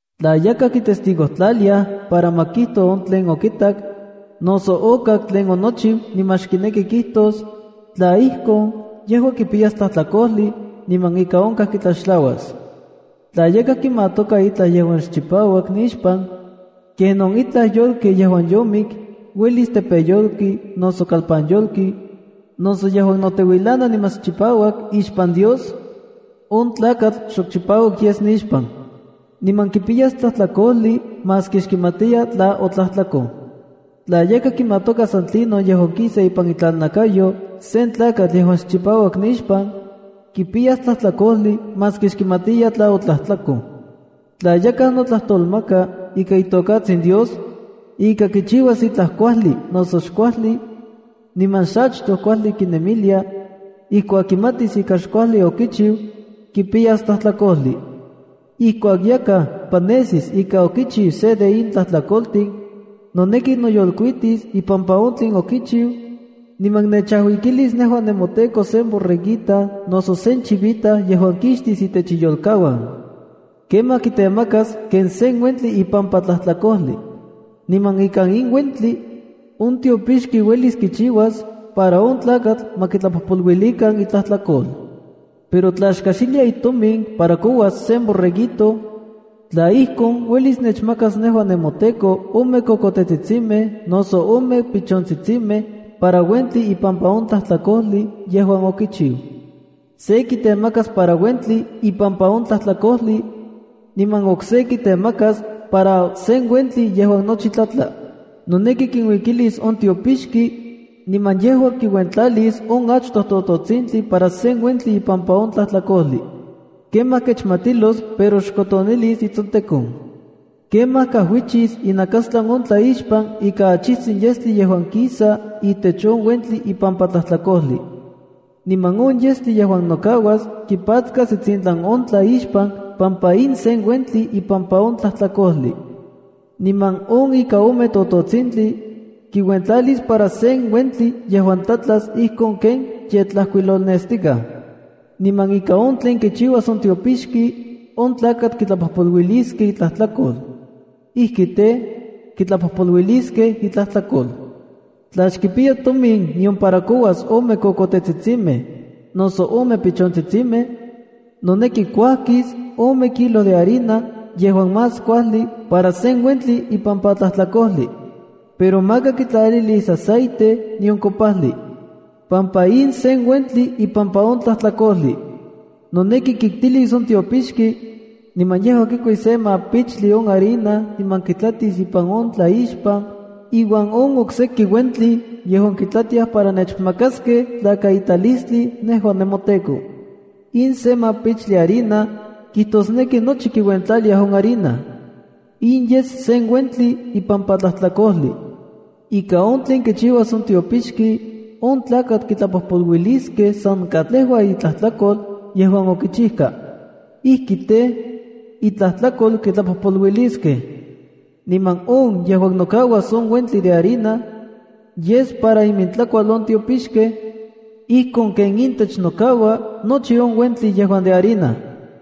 ’Tla yakaj kitestigojtlaliaj para ma kijto on tlen okitak, noso okak tlen onochiu niman xkineki kijtos, tla ijkon, yejua kipiyas tlajtlakojli, niman ika onkaj kitlaxtlauas. ’Tla yakaj kimatoka itlaj yejuan xchipauak nixpan, kenon itlaj yolki yejuan yomik, uelis tepeyolki noso kalpanyolki, noso yejuan noteuilana niman xchipauak ixpan Dios, on tlakatl xok chipauak yes nixpan, niman kipiyas tlajtlakojli maski xkimatiya tla otlajtlakoj. ’Tla yakaj kimatoka san tlinon yejuan kisa ipan itlalnakayo sen tlakatl yejuan xchipauak nixpan, kipiyas tlajtlakojli maski xkimatiya tla otlajtlakoj. ’Tla yakaj notlajtolmaka ika itokatsin Dios, ika kichiuas itlaj kuajli noso xkuajli, niman xachtoj kuajli kinemilia, ijkuak kimatis ika xkuajli okichiu, kipiyas tlajtlakojli. ’Ijkuak yakaj panesis ika okichiu se de in tlajtlakoltin, noneki noyolkuitis ipampa on tlen okichiu, niman nechajuikilis nejua nemoTEKO sen borreguita noso sen chivita yejuan kixtis itech iyolkauan. Kemaj kitemakas ken se uentli ipampa tlajtlakojli. Niman ikan in uentli, on tiopixki uelis kichiuas para on tlakatl ma kitlapojpoluilikan itlajtlakol. ’Pero tla xkajxilia itomin para kouas sen borreguito, tla ijkon, uelis nechmakas nejua nemoTEKO ome kokotetsitsimej noso ome pichontsitsimej para uentli ipampa on tlajtlakojli yejuan okichiu. Se kitemakas para uentli ipampa on tlajtlakojli, niman okse kitemakas para sen uentli yejuan nochi tlatla. Noneki kinuikilis on tiopixki, niman yejua kiuentlalis on achtoj tototsintli para sen uentli ipampa on tlajtlakojli. Kemaj kechmatilos pero xkotonilis itsontekon. Kemaj kajuichis inakastlan on tlaixpan ika achijtsin yestli yejuan kisa itech on uentli ipampa tlajtlakojli. Niman on yestli yejuan nokauas kipatskas itsintlan on tlaixpan pampa in sen uentli ipampa on tlajtlakojli. Niman on ika ome tototsintli, kiuentlalis para sen uentli yejuan tlatlas ijkon ken ye tlajkuilolnestikaj. Niman ika on tlen kichiuas on tiopixki, on tlakatl kitlapojpoluiliskej itlajtlakol. Ijki tej, kitlapojpoluiliskej itlajtlakol. ’Tla xkipiya tomin nion para kouas ome kokotetsitsimej noso ome pichontsitsimej, noneki kuajkis ome kilo de harina yejuan más kuajli, para sen uentli ipampa tlajtlakojli. Pero maka kitlalilis aceite nion kopajli, pampa in sen uentli ipampa on tlajtlakojli. Noneki kiktilis on tiopixki, niman yejua kikuis se mapichtli on harina niman kitlatis ipan on tlaixpan iuan on okseki uentli yejuan kitlatiaj para nechmakaskej tlakaitalistli nejua nemoTEKO. In se mapichtli harina kijtosneki nochi kiuentlalia on harina. In yes sen uentli ipampa tlajtlakojli. Ika on tlen kichiuas on tiopixki, on tlakatl kitlapojpoluiliskej san katlejua itlajtlakol yejuan okichijka. Ijki tej, itlajtlakol kitlapojpoluiliskej. Niman on yejuan nokauas on uentli de harina, yes para imintlakual on tiopixkej, ijkon ken intech nokaua nochi on uentli yejuan de harina.”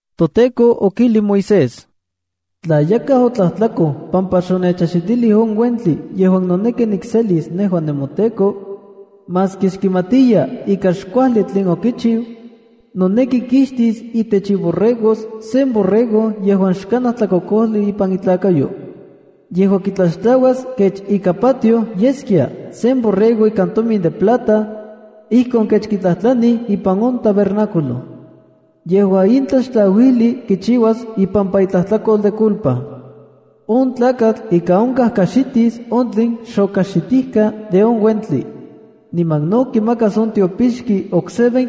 ToTEKO okijli Moisés: “Tla yakaj otlajtlakoj pampa xonechajxitilij on uentli yejuan noneki nikselis nejua nemoTEKO, maski xkimatiya ika xkuajli tlen okichiu, noneki kixtis itech iborregos sen borrego yejuan xkanaj tlakokojli ipan itlakayo. Yejua kitlaxtlauas kech ika patioj yeskia sen borrego ikan tomin de plata, ijkon kech kitlajtlanij ipan on tabernáculo. Yejua in tlaxtlauijli kichiuas ipampa itlajtlakol de culpa. On tlakatl ika onkaj kajxitis on tlen xokajxitijka de on uentli. Niman no kimakas on tiopixki okse